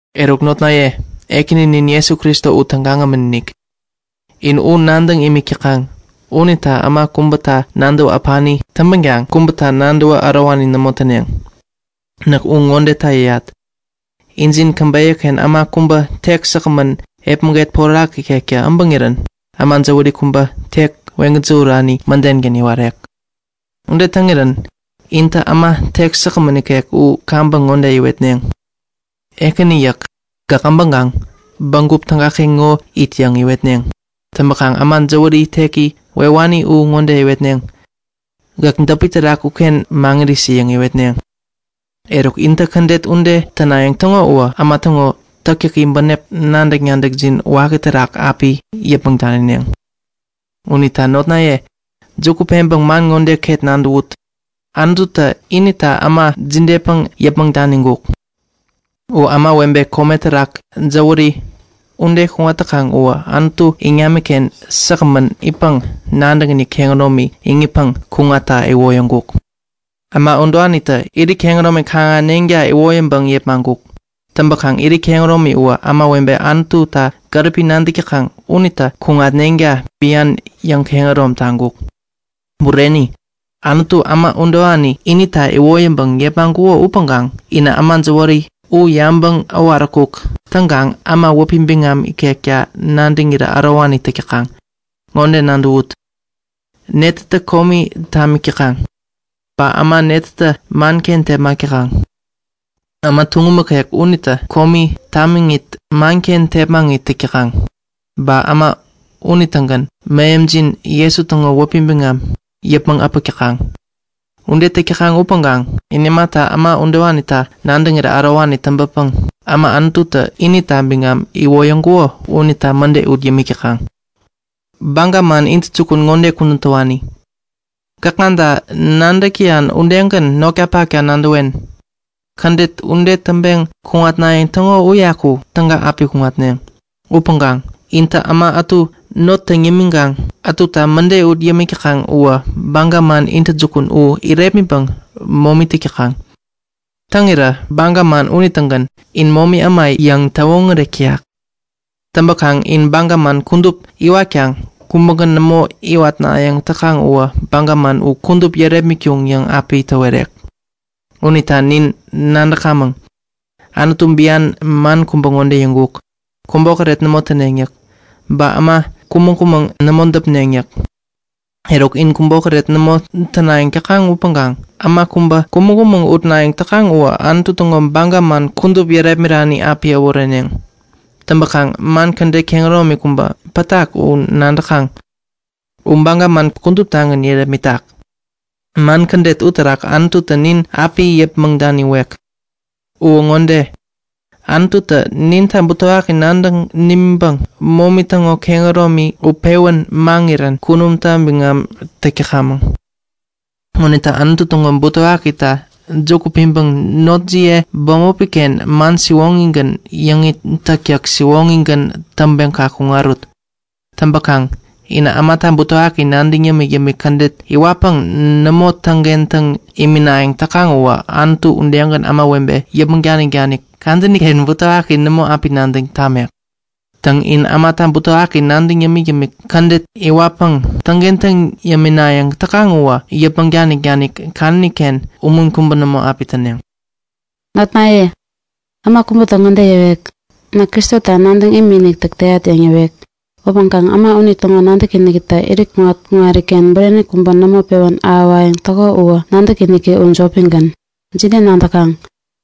Eruk notnaye, Ekäninin Jesu Kristo u tägagämän-inik. In u nadäŋ imik täkaŋ unita äma kubäta nadäwä äpani täŋpänkaŋ kubäta nadäwä ärowani nämo täneŋ. Näk u ŋodeta yäyat; Injin käbeyä-ken äma kubä tek säkgämän epmäget porak ikektä äbäŋirän äma jäwäri kubä teki weŋ-gäjähurani mädengän iwarek. Ude täŋirän intä äma tek säkgämän ikek u kaŋpäŋ ŋode iwetneŋ; Ekäni yäk. Gäk abäŋkaŋ bägup tägaken ŋo it yäŋ iwetneŋ. Täŋpäkaŋ äma jäwäri teki wewani u ŋode iwetneŋ; Gäk däpi terak uken maŋirisi yäŋ iwetneŋ. Eruk, intä kädet ude tänayäŋ täŋo uwä äma täŋo täktäki bänep nadäk-nadäkjin waki terak api yäpmäŋ danineŋ. Unita notnaye, juku peŋpäŋ man ŋo ket nadäwut! Anututä inita äma jidepäŋ yäpmäŋ daniŋkuk? U ämawebe kome terak jäwäri ude kuŋat täkaŋ uwä Anutu iŋamiken säkgämän itpäŋ nadäkiniki kehäromi iŋitpäŋ kuŋatta iwoyäŋkuk. Äma udewanitä kaŋ iwat yewani gänaŋ bok itneŋta iwoyäŋpäŋ yepmaŋkuk. Täŋpäŋ irit kehäromi uwä ämawebe Anututa gäripi nadäk täkaŋ unitä kaŋ-ahäneŋta bian yäŋkehärom taŋkuk. Bureni! Anututä äma udewani inita iwoyäŋpäŋ yepmaŋkuko upäŋkaŋ inä äma jäwäri u yabäŋ äwaräkuk täŋkaŋ äma wäpi biŋam ikekta nadäŋirä ärowani täk täkaŋ. Ŋode nadäwut; Netätä komi tamik täkaŋ? Ba äma netätä manken tepmak täkaŋ? Äma tuŋum ikek unitä komi tamiŋit, manken tepmaŋit täk täkaŋ. Ba äma unitägän Mähemjin Jesu täŋo wäpi biŋam yäpmäŋ äpäk täkaŋ. Ude täk täkaŋ upäŋkaŋ in imata äma udewanita nadäŋirä ärowani täŋpäpäŋ äma Anututä inita biŋam iwoyäŋkuko unita mäde ut yämik täkaŋ? Unita baga man miŋi ŋode kudän täwani; Gäkŋata nadäk täyan udegän notkapakta nadäwen. Kädet ude täŋpeŋ kuŋatnayäŋ täŋo uyaku täga api kuŋatneŋ. Upäŋkaŋ intä äma ätu not täŋ yämiŋkaŋ ätuta mäde ut yämik täkaŋ uwä baga man miŋi u irepmitpäŋ momi täk täkaŋ. Täŋirä baga man unitägän In baga man irepmirani yäŋ täwoŋärek täyak. Täŋpäkaŋ in baga man kudup iwatkaŋ kubägän nämo iwatnayäŋ täkaŋ uwä baga man u kudup yärepmitkuŋ yäŋ api täwerek. Unita nin nadäkamäŋ, Anututä bian man kubä ŋode yäŋkuk; Kubokäret nämo täneŋ yäk. Ba kubä pen ŋode yäkgän täŋkuk; Äma kumäŋ-kumäŋ nämo däpneŋ yäk. Eruk, in kubokäret nämo tänayäŋ täkaŋ upäŋkaŋ äma kubä kumäŋ-kumäŋ utnayäŋ täkaŋ uwä Anutu täŋo baga man kudup yärepmirani api äworeneŋ. Täŋpäkaŋ man kädet kehäromi kubä pätak u nadäkaŋ. U baga man kuduptagän yärepmitak. Man kädet uterak Anututä nin api yäpmäŋ daniwek. Uwä ŋode; Anututä ninta butewaki nadäŋ nimiŋpäŋ momi täŋo kehäromi utpewän maŋirän kunumta biŋam täk täkamäŋ. Unita Anutu täŋo butewakita juku piŋpäŋ notjiye bämopi-ken man siwoŋigän yäŋit täktäk siwoŋigän täŋpeŋ kaŋ kuŋarut. Täŋpäkaŋ inä ämata butewaki nadäŋ yämik-yämik kädet iwatpäŋ nämo täŋkentäŋ iminayäŋ täkaŋ uwä Anututä udegän ämawebe yäpmäŋ danik-danik kadäni-ken butewaki nämo api nadäŋ tamek. Täŋ, in ämata butewaki nadäŋ yämik-yämik kädet iwatpäŋ täŋkentäŋ yäminayäŋ täkaŋ uwä yäpmäŋ danik-danik kadäni-ken umun kubä nämo api täneŋ. Notnaye, äma kubätä ŋode yäwek; Näk Kristota nadäŋ imikinik täk täyat yäŋ yäwek. Upäŋkaŋ äma unitäŋo nadäkinikitä irit kuŋat-kuŋariken bureni kubä nämo pewän ahäwayäŋ täko uwä nadäkiniki u jopigän. Jide nadäkaŋ?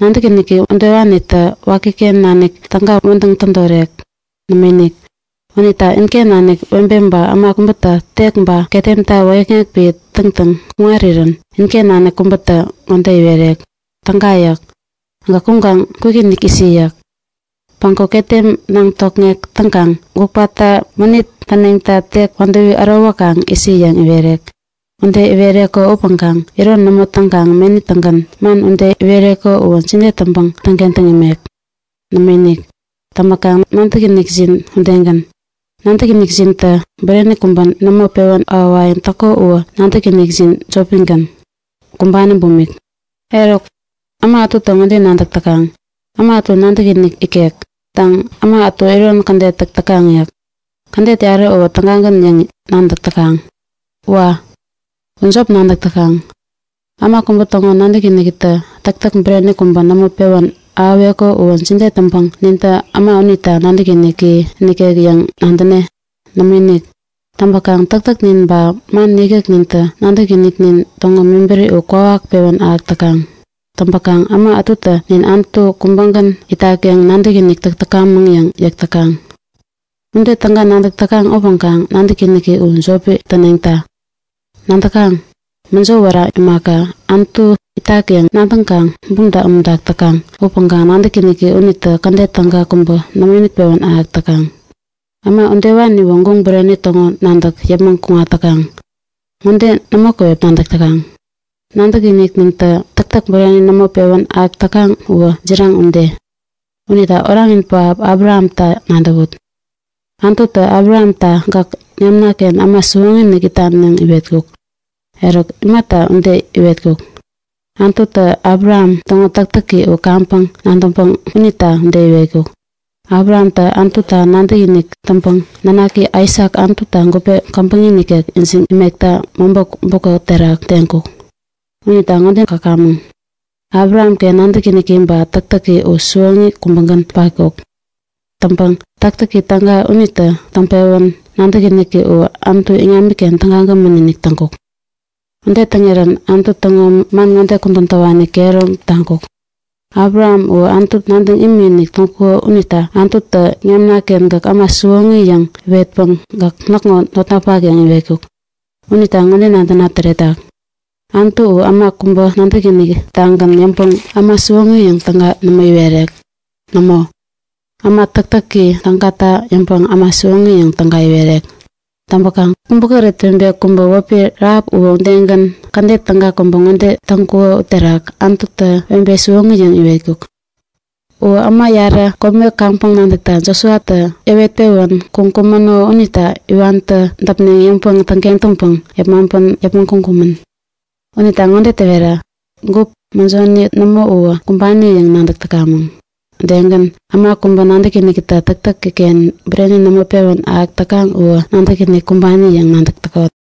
Nadäkiniki udewanitä wakiken nanik täga wädäŋ tädorek? Nämoinik! Unita inken nanik webe ba äma kubätä tek ba ketemta wäyäkŋek piä täŋtäŋ kuŋarirän inken nanik kubätä ŋode iwerek; Täga yäk. Gäk kuŋkaŋ kwikinik isi! yäk. Päŋku ketem naŋ tokŋek täŋkaŋ gupkata mänit täneŋta tek wädäwi ärowäkaŋ isi yäŋ iwerek. Ude iwereko upäŋkaŋ iron nämo täŋkaŋ meni-tägän man ude iwereko uwä jide täŋpäŋ täŋkentäŋ imek? Nämoinik! Täŋpäkaŋ nadäkinikjin udegän. Nadäkinikjintä bureni kubä nämo pewän ahäwayäŋ täko uwä nadäkinikjin jopigän, kumbani bumik. Eruk, äma ätutä ŋode nadäk täkaŋ; Äma ätu nadäkinik ikek. Täŋ, äma ätu iron kädet täk täkaŋ yäk. Kädet yarä uwä tägagän yäŋ nadäk täkaŋ. Wa! U jop nadäk täkaŋ! Äma kubä täŋo nadäkinikitä täktäk bureni kubä nämo pewän ahäweko uwä jide täŋpäŋ nintä äma unita nadäkiniki nikek yäŋ nadäne? Nämoinik! Täŋpäkaŋ täktäknin ba man yäkyäknintä nadäkiniknin täŋo mebäri u kwawak pewän ahäk täkaŋ. Täŋpäkaŋ äma ätutä nin Anutu kubägän itak yäŋ nadäkinik täk täkamäŋ yäŋ yäk täkaŋ. Ude täga nadäk täkaŋ upäŋkaŋ nadäkiniki u jopi täneŋta. Nadäkaŋ? Mäjo wära imaka, Anutu itak yäŋ nadäŋkaŋ bumta umuntak täkaŋ upäŋkaŋ nadäkiniki unitä kädet täga kubä nämoinik pewän ahäk täkaŋ. Äma udewaniwä guŋ bureni täŋo nadäk yäpmäŋ kuŋat täkaŋ! Ŋode nämo käwep nadäk täkaŋ; Nadäkiniknintä täktäk bureni nämo pewän ahäk täkaŋ uwä jiraŋ ude. Unita Oranin pähap Abrahamta nadäwut. Anututä Abrahamta Gäk iŋamna-ken äma siwoŋi-inik itan yäŋ iwetkuk. Eruk, imata ude iwetkuk? Anututä Abraham täŋo täktäki u kaŋpäŋ nadäŋpäŋ unita ude iwetkuk. Abrahamtä Anututa nadäkinik täŋpäŋ nanaki Aisak Anututa gupe käbäŋi nikek ijiŋ imekta mobä bukä terak teŋkuk. Unita ŋode käkamäŋ; Abrahamken nadäkiniki ba täktäki u siwoŋi kubägän patkuk. Täŋpäŋ täktäki täga unitä täŋpewän nadäkiniki uwä Anutu iŋamiken tägagämän-inik täŋkuk. Ude täŋirän Anutu täŋo man ŋode kudän täwani kehärom taŋkuk; Abraham uwä Anutu nadäŋ imikinik täŋkuko unita Anututä Iŋamna-ken gäk äma siwoŋi yäŋ iwetpäŋ gäk näkŋo notnapak yäŋ iwetkuk. Unita ŋode nadäna täretak; Anutu uwä äma kubä nadäkiniki-tagän yäŋpäŋ äma siwoŋi yäŋ täga nämo iwerek. Nämo! Bureni uwä, täktäki tägata yäŋpäŋ äma siwoŋi yäŋ täga iwerek. Täŋpäkaŋ kubokäret webe kubä wäpi Rahap uwä udegän kädet täga kubä ŋode täŋkuko uterak Anututä webe siwoŋi yäŋ iwetkuk. Uwä äma yarä kome kaŋpäŋ nadäkta Josuatä yäwet-pewän kuŋkumäno unita iwantä däpneŋ yäŋpäŋ täŋkentäŋpäŋ yepmaŋpän yäpmäŋ kuŋkumän. Unita ŋode täwetat; Gup, mäjoni nämo uwä kumbani yäŋ nadäk täkamäŋ. Udegän äma kubä nadäkinikitä täktäki-ken bureni nämo pewän ahäk täkaŋ uwä nadäkiniki kumbani yäŋ nadäk täkot.